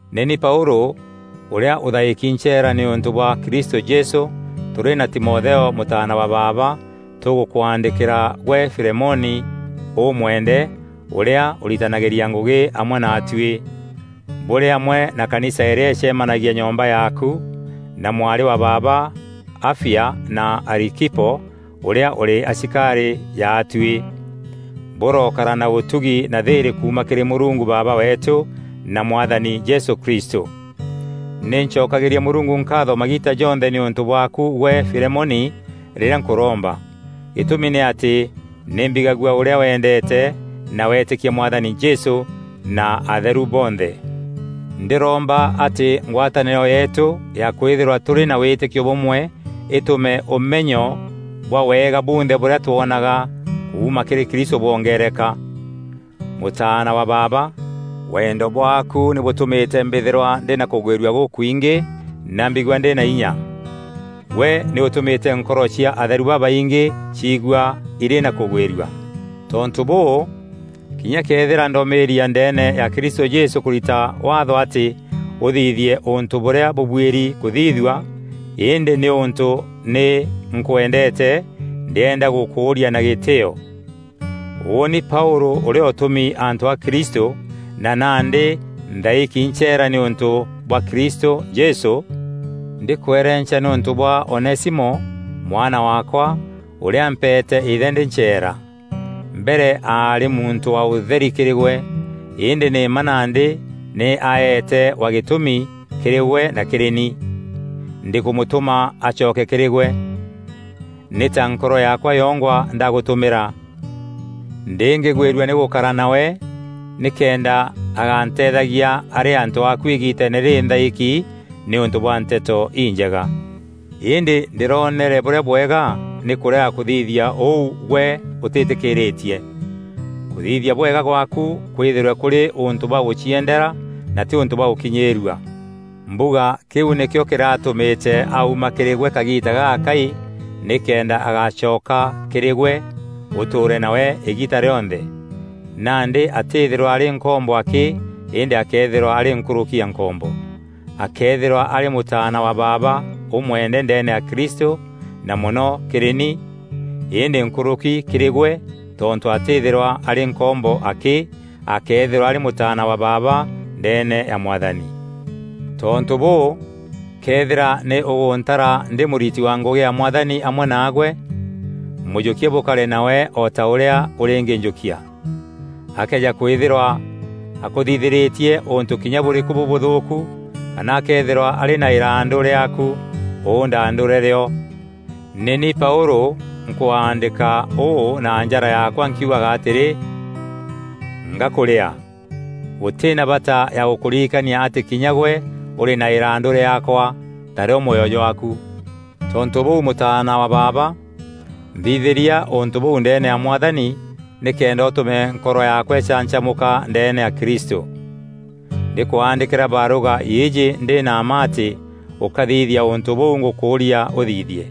Nî ni Paûlû ûrîa ûthaîki ncheera nîûntû bwa Kristû Jesû, tûrî na Timotheo mûtaana wa baaba, Tûgûkwandîkîra gwe Filemoni ûmweende, ûrîa ûritanagîria ngûgî amwe naatuî, bûrî amwe na kanisa îrîa îcemanagia nyomba yaaku, na mwarî wa baaba Afia, na Arikipo, ûrîa ûrî asikarî jaatuî. Bûrokara na ûtugi na thîîrî kuuma kîrî Mûrungu Baaba weetû na Mwathani Jesû Kristû. Nî ncokagîria Mûrungu nkaatho magiita jonthe nîûntû bwaaku gwe Filemoni rîrîa nkûromba. Gîtûmi nî atî nî mbigagua ûrîa wendeete na wetîkia Mwathani Jesû na atheru bonthe. Ndîromba atî ngwatanîro yeetû ya kwîthîrwa tûrî na wîtîkio bûmwe îtûme ûmenyo bwa wega bunthe bûrîa twonaga kuuma kîrî Kristû bwongeereka. Mûtaana wa baaba, wendo bwaaku nî bûtûmîte mbîthîrwa ndî na kûgwîrua gûkwingî na mbigua ndî na inya. Gwe nî ûtûmîte nkoro cia atheru babaingî ciigua îrî na kûgwîrua. Tontû bûû, kinya këethîra ndomîîria ndeene ya Kristû Jesû kûrita waatho atî ûthithie ûntû bûrîa bûbuîri kûthithua, îndî nîûntû nî nkwendeete, ndîenda gûkûûria na gîtîîo. Ûûni Paûlû ûrîa ûtûmi antû a Kristû, na nandî nthaîki ncheera nîûntû bwa Kristû Jesû, ndîkwerenca nîûntû bwa Onesimo, mwana waakwa, ûrîa mpeete îthe ndî ncheera. Mbere aarî muntû wa ûtheri kîrî gwe. Îndî nî mma nandî nî aeete wa gîtûmi kîrî gwe na kîrî ni. Ndîkûmûtûma acoke kîrî gwe; nî ta nkoro yaakwa yongwa ndagûtûmîra. Ndîngîgwîrua nî gûkara nawe nîkenda aganteethagia arî antû aku îgiiteene rîrî nthaîki nîûntû bwa Nteto Injega. Îndî ndîroonere bûrîa bwega nî kûrega kûthithia ûu gwe ûtîtîkîîrîtie. Kûthithia bwega gwaaku kwîthîrwe kûrî ûntû bwa gûciendera na tî ûntû bwa gûkinyîîrua. Mbuga kîu nîkîo kîratûmîte auma kîrî gwe kagiita gagakai nîkenda agacoka kîrî gwe ûtûûre nawe îgiita rîonthe. Nandî atîîthîrwa arî nkombo akî îndî akeethîrwa arî nkûrûki ya nkombo. Akeethîrwa arî mûtaana wa baaba ûmwende ndeene ya Kristû na mono kîrî ni, îndî nkûrûki kîrî gwe tontû atîîthîrwa arî nkombo akî; akeethîrwa arî mûtaana wa baaba ndeene ya Mwathani. Tontû bûû, këethîra nî ûgûntara ndî mûriti wa ngûgî ya Mwathani amwe naagwe, mûjûkie bûkare nawe o ta ûrîa ûrîngînjûkia. Akëeja kwîthîrwa akûthithîrîtie ûntû kinya bûrîkû bûbûthûûku kana akëethîrwa arî na îrandû rîaaku, ûndaandûre rîo. Nî ni Paûlû nkwaandîka ûû na njara yaakwa nkiugaga atîrî, “Ngakûrîaa.” Gûtî na bata ya gûkûririkania atî kinya gwe ûrî na îrandû rîaakwa, tarîo mwoyo jwaaku. Tontû bûu mûtaana wa baaba, nthithîria ûntû bûu ndeene ya Mwathani nîkenda ûtûme nkoro yaakwa îcancamûka ndeene ya Kristû. Ndîkwaandîkîra barûga îîjî ndî na mma atî ûkathithia ûntû bûu ngûkûûria ûthithie.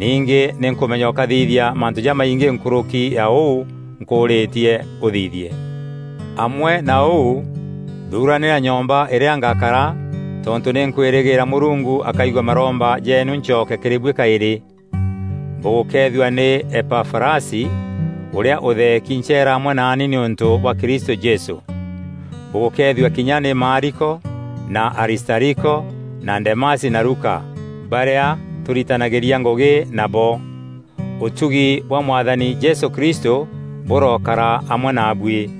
Ningî nî nkûmenya ûkathithia mantû jamaingî nkûrûki ya ûu nkûûrîtie ûthithie. Amwe na ûu thuranîra nyomba îrîa ngakara tontû nî nkwîrîgîîra Mûrungu akaigua maromba jeenu ncoke kîrî buî kaîrî. Bûgûkeethua nî Epafarasi, ûrîa ûtheeki ncheera amwe naani nîûntû bwa Kristû Jesû. Bûgûkeethua kinya nî Maariko na Aristariko na Demasi na Luka barîa tûritanagîria ngûgî nabo. Ûtugi bwa Mwathani Jesû Kristû bûrokara amwe naabuî.